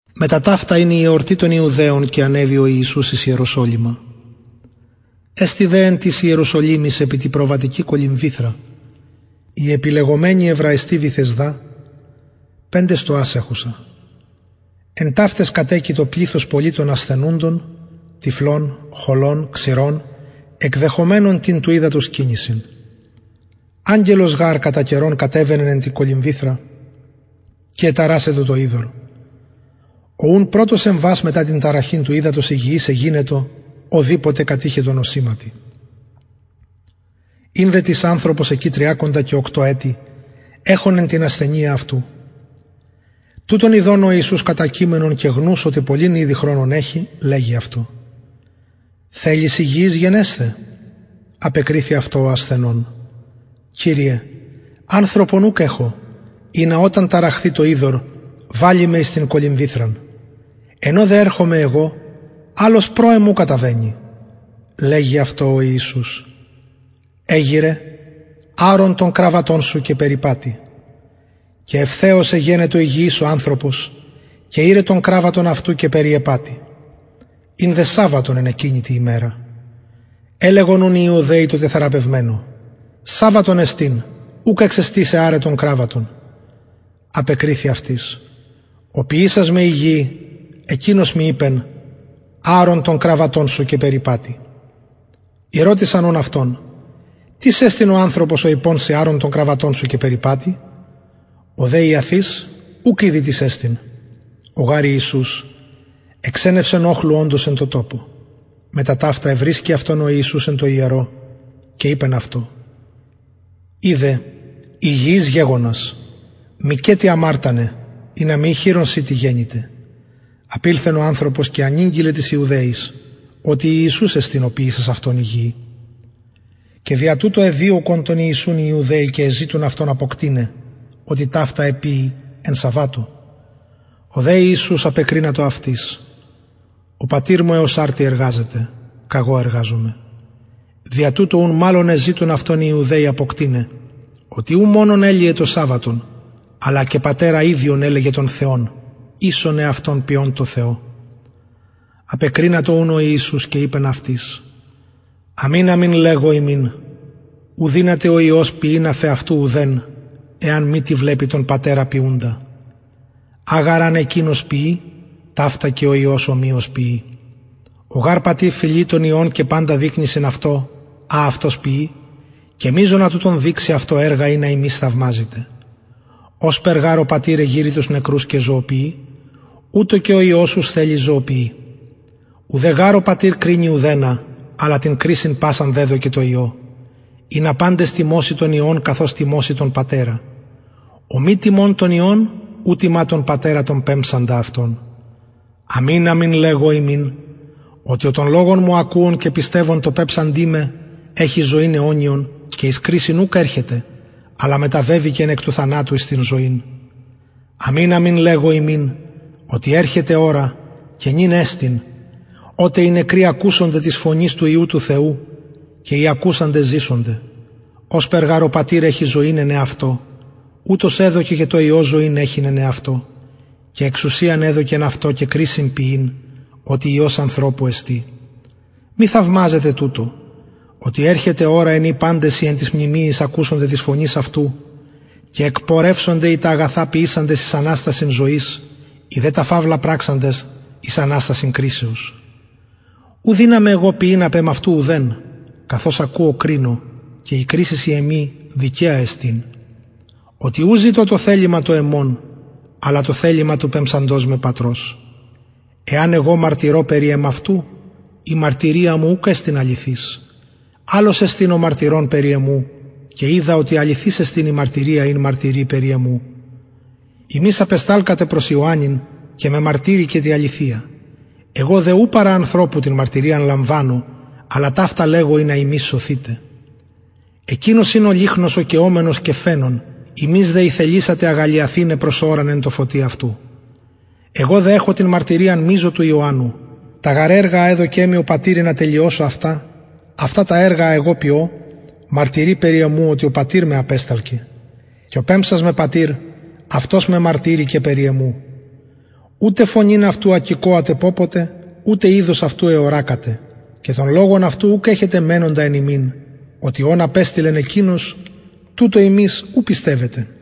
μετα ταυτα ην η εορτη των ιουδαιων και ανεβη ο ιησους εις ιεροσολυμα εστιν δε εν τοις ιεροσολυμοις επι τη προβατικη κολυμβηθρα η επιλεγομενη εβραιστι βηθεσδα πεντε στοας εχουσα εν ταυταις κατεκειτο πληθος πολυ των ασθενουντων τυφλων χωλων ξηρων εκδεχομενων την του υδατος κινησιν αγγελος γαρ κατα καιρον κατεβαινεν εν τη κολυμβηθρα και εταρασσεν το υδωρ ο ουν πρωτος εμβας μετα την ταραχην του υδατος υγιης εγινετο ω δηποτε κατειχετο νοσηματι ην δε τις ανθρωπος εκει τριακοντα οκτω ετη εχων εν τη ασθενεια τουτον ιδων ο ιησους κατακειμενον και γνους οτι πολυν ηδη χρονον εχει λεγει αυτω θελεις υγιης γενεσθαι απεκριθη αυτω ο ασθενων κυριε ανθρωπον ουκ εχω ινα οταν ταραχθη το υδωρ βαλη με εις την κολυμβηθραν εν ω δε ερχομαι εγω αλλος προ εμου καταβαινει λεγει αυτω ο ιησους εγειραι αρον τον κραββατον σου και περιπατει και ευθεως εγενετο υγιης ο ανθρωπος και ηρεν τον κραββατον αυτου και περιεπατει ην δε σαββατον εν εκεινη τη ημερα ελεγον ουν οι ιουδαιοι τω τεθεραπευμενω σαββατον εστιν ουκ εξεστιν σοι αραι τον κραββατον απεκριθη αυτοις ο ποιησας με υγιη εκεινος μοι ειπεν αρον τον κραββατον σου και περιπατει ηρωτησαν ουν αυτον τις εστιν ο ανθρωπος ο ειπων σοι αρον τον κραββατον σου και περιπατει ο δε ιαθεις ουκ ηδει τις εστιν ο γαρ ιησους εξενευσεν οχλου οντος εν τω τοπω μετα ταυτα ευρισκει αυτον ο ιησους εν τω ιερω και ειπεν αυτω ιδε υγιης γεγονας μηκετι αμαρτανε ινα μη χειρον τι σοι γενηται απηλθεν ο ανθρωπος και ανηγγειλεν τοις ιουδαιοις οτι ιησους εστιν ο ποιησας αυτον υγιη και δια τουτο εδιωκον τον ιησουν οι ιουδαιοι και εζητουν αυτον αποκτειναι οτι ταυτα εποιει εν σαββατω ο δε ιησους απεκρινατο αυτοις ο πατηρ μου εως αρτι εργαζεται καγω εργαζομαι δια τουτο ουν μαλλον εζητουν αυτον οι ιουδαιοι αποκτειναι οτι ου μονον ελυεν το σαββατον αλλα και πατερα ιδιον ελεγεν τον θεον ισον εαυτον ποιων τω θεω απεκρινατο ουν ο ιησους και ειπεν αυτοις αμην αμην λεγω υμιν ου δυναται ο υιος ποιειν αφ εαυτου ουδεν εαν μη τι βλεπη τον πατερα ποιουντα α γαρ αν εκεινος ποιη ταυτα και ο υιος ομοιως ποιει ο γαρ πατηρ φιλει τον υιον και παντα δεικνυσιν αυτω α αυτος ποιει και μειζονα τουτων δειξει αυτω εργα ινα υμεις θαυμαζητε ωσπερ γαρ ο πατηρ εγειρει τους νεκρους και ζωοποιει ουτως και ο υιος ους θελει ζωοποιει ουδε γαρ ο πατηρ κρινει ουδενα αλλα την κρισιν πασαν δεδωκεν τω υιω ινα παντες τιμωσιν τον υιον καθως τιμωσιν τον πατερα ο μη τιμων τον υιον ου τιμα τον πατερα τον πεμψαντα αυτον αμην αμην λεγω υμιν οτι ο τον λογον μου ακουων και πιστευων τω πεμψαντι με εχει ζωην αιωνιον και εις κρισιν ουκ ερχεται αλλα μεταβεβηκεν εκ του θανατου εις την ζωην αμην αμην λεγω υμιν οτι ερχεται ωρα και νυν εστιν οτε οι νεκροι ακουσονται της φωνης του υιου του θεου και οι ακουσαντες ζησονται ωσπερ γαρ ο πατηρ εχει ζωην εν εαυτω ουτως εδωκεν και τω υιω ζωην εχειν εν εαυτω και εξουσιαν εδωκεν αυτω και κρισιν ποιειν οτι υιος ανθρωπου εστιν μη θαυμαζετε τουτο οτι ερχεται ωρα εν η παντες οι εν τοις μνημειοις ακουσονται της φωνης αυτου και εκπορευσονται οι τα αγαθα ποιησαντες εις αναστασιν ζωης οι δε τα φαυλα πραξαντες εις αναστασιν κρισεως ου δυναμαι εγω ποιειν απ εμαυτου ουδεν καθως ακουω κρινω και η κρισις η εμη δικαια εστιν οτι ου ζητω το θελημα το εμον αλλα το θελημα του πεμψαντος με πατρος εαν εγω μαρτυρω περι εμαυτου η μαρτυρια μου ουκ εστιν αληθης αλλος εστιν ο μαρτυρων περι εμου και οιδα οτι αληθης εστιν η μαρτυρια ην μαρτυρει περι εμου υμεις απεσταλκατε προς ιωαννην και μεμαρτυρηκεν τη αληθεια εγω δε ου παρα ανθρωπου την μαρτυριαν λαμβανω αλλα ταυτα λεγω ινα υμεις σωθητε εκεινος ην ο λυχνος ο καιομενος και φαινων υμεις δε ηθελησατε αγαλλιαθηναι προς ωραν εν τω φωτι αυτου εγω δε εχω την μαρτυριαν μειζω του ιωαννου τα γαρ εργα α εδωκεν μοι ο πατηρ ινα τελειωσω αυτα αυτα τα εργα α εγω ποιω μαρτυρει περι εμου οτι ο πατηρ με απεσταλκεν και ο πεμψας με πατηρ αυτος μεμαρτυρηκεν περι εμου ουτε φωνην αυτου ακηκοατε πωποτε ουτε ειδος αυτου εωρακατε και τον λογον αυτου ουκ εχετε μενοντα εν υμιν οτι ον απεστειλεν εκεινος τουτω υμεις ου πιστευετε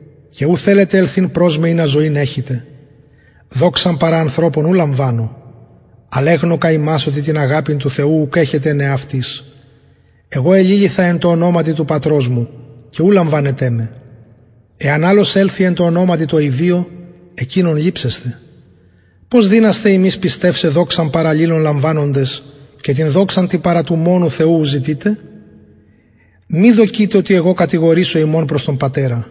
και ου θελετε ελθειν προς με ινα ζωην εχητε δοξαν παρα ανθρωπων ου λαμβανω αλλ εγνωκα υμας οτι την αγαπην του θεου ουκ εχετε εν εαυτοις εγω εληλυθα εν τω ονοματι του πατρος μου και ου λαμβανετε με εαν αλλος ελθη εν τω ονοματι τω ιδιω εκεινον ληψεσθε πως δυνασθε υμεις πιστευσαι δοξαν παρα αλληλων λαμβανοντες και την δοξαν την παρα του μονου θεου ου ζητειτε μη δοκειτε οτι εγω κατηγορησω υμων προς τον πατερα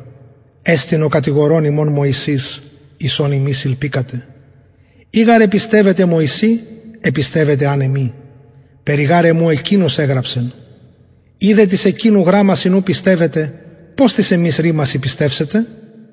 εστιν ο κατηγορων υμων μωσης εις ον υμεις ηλπικατε ει γαρ επιστευετε μωση επιστευετε αν εμοι περι γαρ εμου εκεινος εγραψεν ει δε τοις εκεινου γραμμασιν ου πιστευετε πως τοις εμοις ρημασιν πιστευσετε